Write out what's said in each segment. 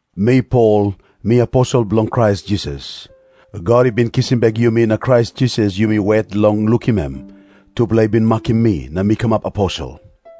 Mi Pol, mi aposel bilong Krais Jisas. God i bin kisim bek yumi na Krais Jisas yumi wet long lukim em, tupela i bin makim mi na mi kamap aposel.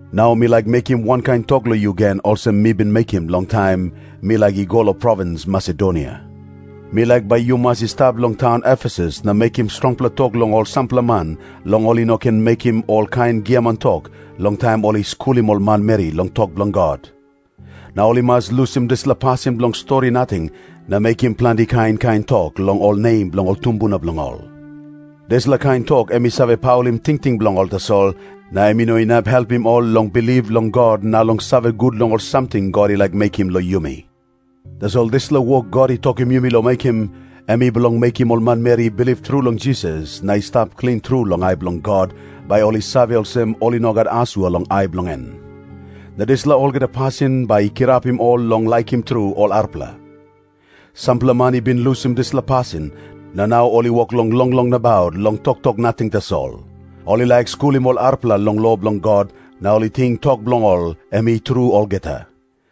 Nau mi laik mekim wankain tok long yu gen olsem mi bin mekim long taim mi laik i go long provins Masedonia. Mi laik bai yu mas i stap yet long taun Efesus na mekim strongpela tok long sampela man long ol i no ken mekim olkain giaman tok long taim ol i skulim ol manmeri long tok bilong God. Na ol i mas lusim dispela pasin bilong stori nating na mekim planti kain kain tok long ol nem bilong ol tumbuna bilong ol. Dispela kain tok em i save paulim tingting bilong ol tasol, na em i no inap helpim ol long bilip long God na long save gut long ol samting God i laik mekim long yumi. Tasol dispela wok God i tokim yumi long mekim, em i bilong mekim ol manmeri i bilip tru long Jisas na i stap klin tru long ai bilong God, bai ol i save olsem ol i no gat asua long ai bilong en. Na dispela olgeta pasin bai i kirapim ol long laikim tru ol arapela. Sampela man i bin lusim dispela pasin, na nau ol i wok long longlong nabaut long toktok nating tasol. Ol i laik skulim ol arapela long lo bilong God, na ol i ting tok bilong ol em i tru olgeta.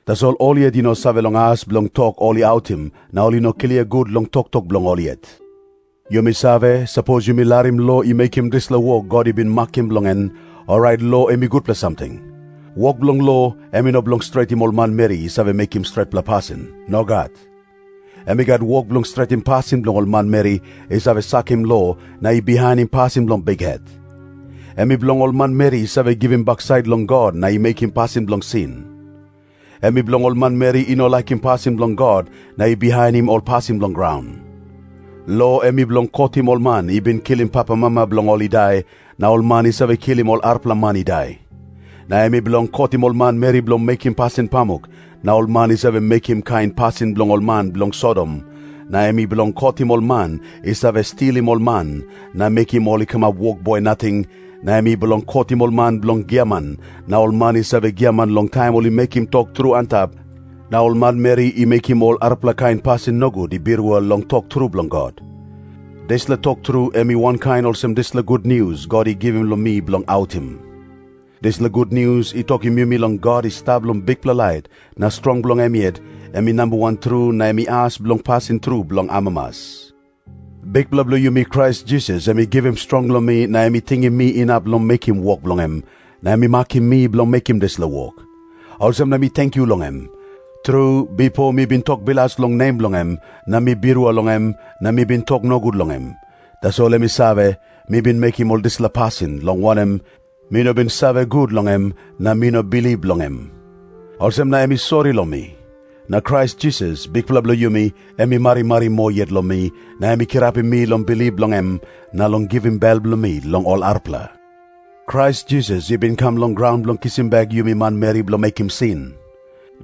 Tasol ol yet ol i no save long as bilong tok ol i autim, na ol i no klia gut long toktok bilong ol yet. Yumi save, sapos yumi larim lo i mekim dispela wok God i bin makim bilong en, orait lo em i gutpela samting. Wok bilong lo, em i no bilong stretim ol manmeri i save mekim stretpela pasin. Nogat. Em i gat wok bilong stretim pasin bilong ol manmeri i save sakim lo na i bihainim pasin bilong bikhet. Em i bilong ol manmeri i save givim baksait long God na i mekim pasin bilong sin. Em i bilong ol manmeri i no laikim pasin bilong God na i bihainim ol pasin bilong graun. Lo em i bilong kotim ol man i bin kilim papamama bilong ol i dai, na ol man i save kilim ol arapela man i dai. Na em i bilong kotim ol manmeri bilong mekim pasin pamuk na ol man i save mekim kain pasin bilong ol man bilong Sodom, na em i bilong kotim ol man i save stilim ol man na mekim ol i kamap wokboi nating, na em i bilong kotim ol man bilong giaman na ol man i save giaman long taim ol i mekim tok tru antap na ol manmeri i mekim ol arapela kain pasin nogut i birua long tok tru bilong God. Dispela tok tru em i wankain olsem dispela gutnius God i givim long mi bilong autim. Dispela gutnius i tokim yumi long God i stap long bikpela lait na strong bilong em yet, em i nambawan tru na em i as bilong pasin tru bilong amamas. Bikpela bilong yumi Krais Jisas em i givim strong long mi na em i tingim mi inap long mekim wok bilong em, na em i makim mi bilong mekim dispela wok. Olsem na mi tenkyu long em. Tru, bipo mi bin tok bilas long nem bilong em, na mi birua long em na mi bin tok nogut long em. Tasol em i save, mi bin mekim ol dispela pasin, long wanem, mi no bin save gut long em na mi no bilip long em. Olsem na em i sori long mi. Na Krais Jisas, Bikpela bilong yumi, em i marimari moa yet long mi, na em i kirapim mi long bilip long em na long givim bel bilong mi long ol arapela. Krais Jisas i bin kam long graun bilong kisim bek yumi manmeri bilong mekim sin.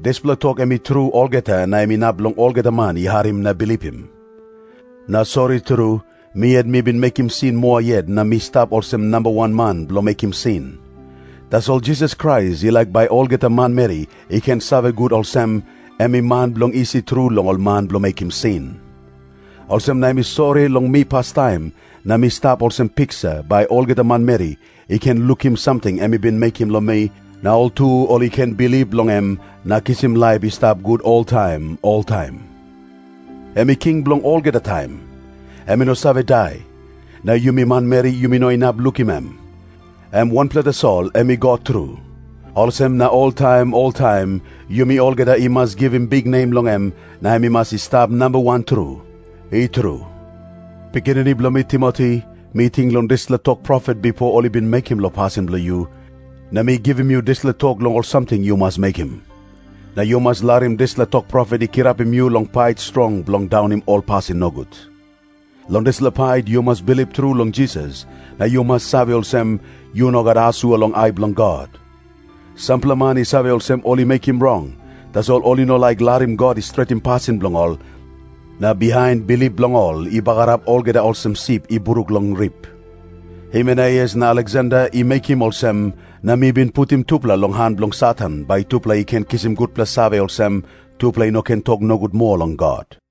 Dispela tok em i tru olgeta na em inap long olgeta man i harim na bilipim. Na sori tru, mi yet mi bin mekim sin moa yet na mi stap olsem namba wan man bilong mekim sin. Tasol Jisas Krais i laik bai olgeta manmeri i ken save gut olsem, em i man bilong isi tru long ol man bilong mekim sin. Olsem na em i sori long mi pastaim, na mi stap olsem piksa, bai olgeta manmeri i ken lukim samting em i bin mekim long mi, na ol tu ol i ken bilip long em na kisim laip i stap gut oltaim oltaim. Em i King bilong olgeta taim. Em i no save dai, na yumi manmeri yumi no inap lukim em. Em wanpela tasol em i God tru. Olsem na oltaim oltaim yumi olgeta i mas givim biknem long em na em i mas i stap namba wan tru. I tru. Pikinini bilong mi Timoti, mi ting long dispela tok profet bipo ol i bin mekim long pasin bilong yu, na mi givim yu dispela tok long ol samting yu mas mekim. Na yu mas larim dispela tok profet i kirapim yu long pait strong bilong daunim ol pasin nogut. Long dispela pait yu mas bilip tru long Jisas na yu mas save olsem yu no gat asua long ai bilong God. Sampela man i save olsem ol i mekim rong, tasol ol i no laik larim God i stretim pasin bilong ol, na bihain bilip bilong ol i bagarap olgeta olsem sip i bruk long rip. Himeneus na Aleksander i mekim olsem, na mi bin putim tupela long han bilong Satan, bai tupela i ken kisim gutpela save olsem, tupela i no ken tok nogut moa long God.